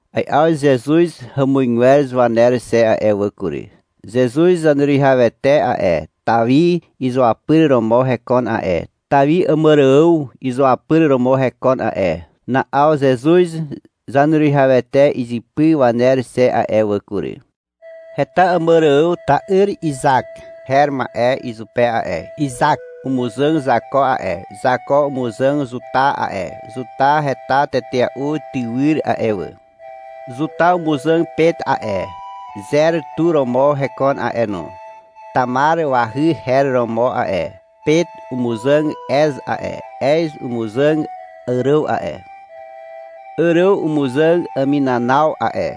Ai'aw Zezuz hàmuzgwer waner xe a'e wà kury. Zezuz Zaneruwihawete a'e, Tawi izuapyr romo hekon a'e. Tawi Àmàrààw izuapyr romo hekon a'e. Na'aw Zezuz Zaneruwihawete izypy waner xe a'e wà kury. Heta Àmàrààw ta'yr Izak her ma'e izupe a'e. Izak umuzàg Zako a'e. Zako umuzàg Zuta a'e, Zuta heta tetea'u tywyr a'e wà. Zuta umuzàg Pet a'e, Zer tu romo hekon a'e no. (Tamar wahy her romo a'e.) Pet umuzàg Ez a'e. Ez umuzàg Àràw a'e. Àràw umuzàg Aminanaw a'e.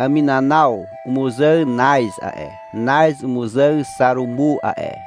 Aminanaw umuzàg Naz a'e. Naz umuzàg Xarumu a'e.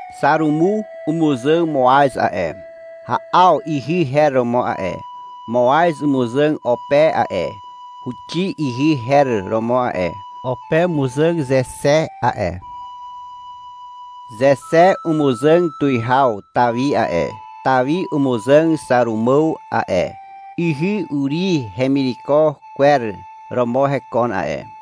Xarumu umuzàg Moaz a'e. (Ha'aw ihy her romo a'e.) Moaz umuzàg Ope a'e. (Huxi ihy her romo a'e.) Ope umuzàg Zexe a'e. Zexe umuzàg tuwihaw Tawi a'e. Tawi umuzàg Xàrumàw a'e. (Ihy Uri hemireko kwer romo hekon a'e.)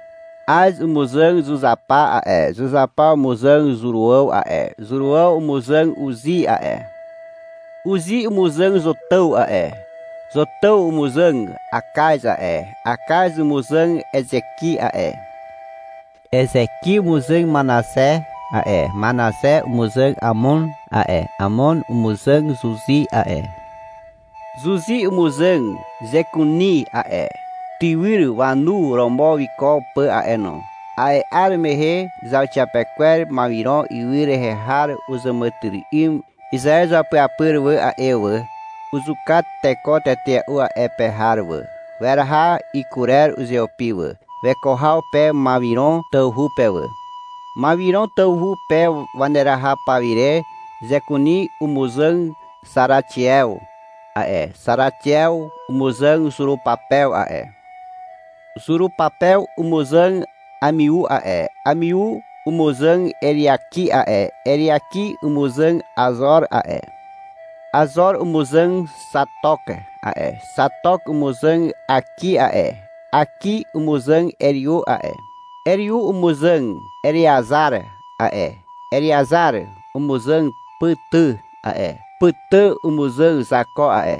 Az umuzàg Zuzapa a'e. Zuzapa umuzàg Zuràw a'e. Zuràw umuzàg Uzi a'e. Uzi umuzàg Zotàw a'e. Zotàw umuzàg Akaz a'e. Akaz umuzàg Ezeki a'e. Ezeki umuzàg Manaxe a'e. Manaxe umuzàg Amon a'e. Amon umuzàg Zuzi a'e. Zuzi umuzàg Zekuni a'e, tywyr wanu romo wiko pà a'e no. A'e 'ar mehe zauxiapekwer Mawiron ywy rehe har uzàmàtyry'ym Izaew izuapyapyr wà a'e wà. Uzuka teko tetea'u a'e pe har wà. Weraha ikurer uzeupi wà, weko haw pe Mawiron tawhu pe wà. Mawiron tawhu pe waneraha pawire Zekuni umuzàg Xaraxiew a'e. Xaraxiew umuzàg Zurupapew a'e. Zurupapew umuzàg Amiu a'e. Amiu umuzàg Eriaki a'e. Eriaki umuzàg Azor a'e. Azor umuzàg Xatok a'e. Xatok umuzàg Àki a'e. Àki umuzàg Eriu a'e. Eriu umuzàg Ereazar a'e. Ereazar umuzàg Pàtà a'e: Pàtà umuzàg Zako a'e.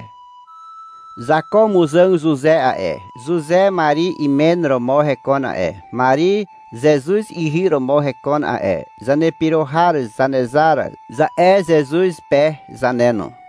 Zako umuzàg Zuze a'e. Zuze Mari imen romo hekon a'e. Mari Zezuz ihy romo hekon a'e. Zanepyro har Zanezar, za'e Zezuz pe zane no.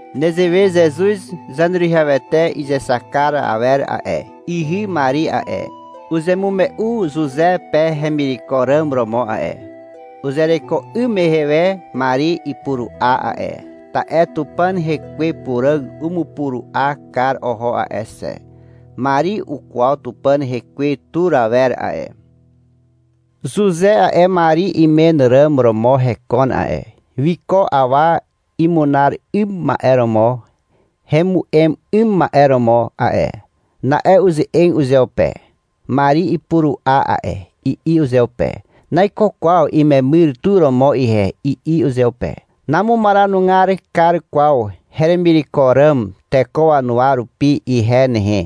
Nezewe Zezuz Zaneruwihawete izexak kar awer a'e. Ihy Mari a'e, uzemume'u Zuze pe hemireko ràm romo a'e. Uzereko 'ym mehe we Mari ipuru'a a'e. Ta'e Tupàn Hekwe Puràg umupuru'a kar oho a'e xe. (Mari ukwaw Tupàn Hekwe tur awer a'e.) Zuze a'e, Mari imen ràm romo hekon a'e, wiko awa imunar 'ym ma'e romo hemu'em 'ym ma'e romo a'e. Na'e uze'eg uzeupe. — Mari ipuru'a a'e, i'i uzeupe. — Naiko kwaw imemyr tu romo ihe, i'i uzeupe. — Namumaranugar kar kwaw heremireko ràm teko wanuwa rupi ihe nehe.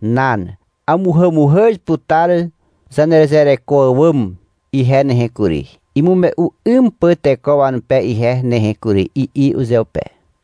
Nan. Amuhàmuhàz putar zanezereko àwàm ihe nehe kury, imume'u 'ym pà teko wanupe ihe nehe kury, i'i uzeupe.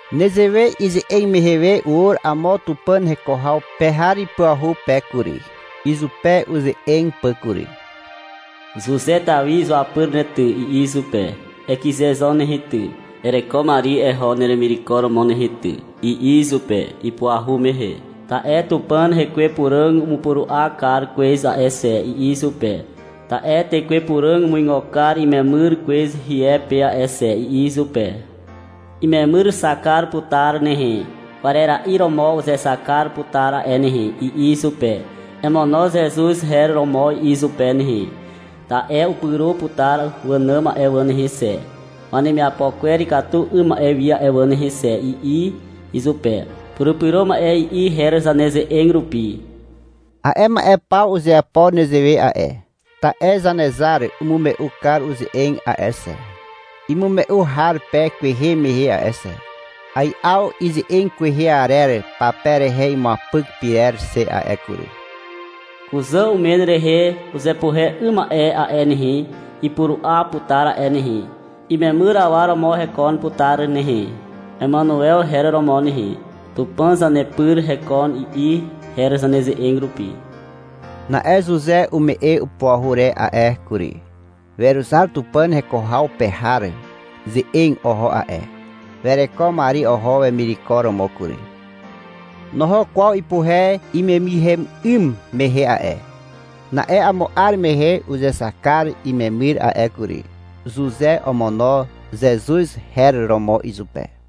Nezewe ize'eg mehe we ur amo Tupàn heko haw pe har ipuahu pe kury, izupe uze'eg pà kury. — Zuze Tawi izuapyr ne ty, i'i izupe. — Ekyze zo nehe ty, ereko Mari eho neremireko romo nehe ty, i'i izupe ipuahu mehe. — Ta'e Tupàn Hekwe Puràg umupuru'a kar kwez a'e xe, i'i izupe. (—Ta'e Tekwe Puràg umuigo kar imemyr kwez hie pe a'e xe, i'i izupe.) — Imemyrxak kar putar nehe. Kwarera'i romo uzexak kar putar a'e nehe, i'i izupe. — Emono Zezuz her romo izupe nehe, ta'e upyro putar wànàm a'e wà nehe xe, wanemiapo kwer ikatu 'ym ma'e wi a'e wà nehe xe, i'i izupe. (— Purupyro ma'e, i'i her zaneze'eg rupi.) A'e ma'e paw uzeapo nezewe a'e, ta'e Zanezar umume'u kar uze'eg a'e xe, imume'u har pe kwehe mehe a'e xe. Ai'aw ize'eg kwehe arer pape rehe imuapyk pyrer xe a'e kury. Kuzà umen rehe uzepuhe 'ym ma'e a'e nehe, Ipuru'a putar a'e nehe. Imemyr awa romo hekon putar nehe. Emanuew, her romo nehe. (— Tupàn zanepyr hekon, i'i her zaneze'eg rupi.) Na'e Zuze ume'e upuahu re a'e kury. Weruzar Tupàn heko haw pe har ze'eg oho a'e. Wereko Mari oho wemireko romo kury. Noho kwaw ipuhe imemyrhem 'ym mehe a'e. Na'e amo 'ar mehe uzexak kar imemyr a'e kury. Zuze omono Zezuz her romo izupe.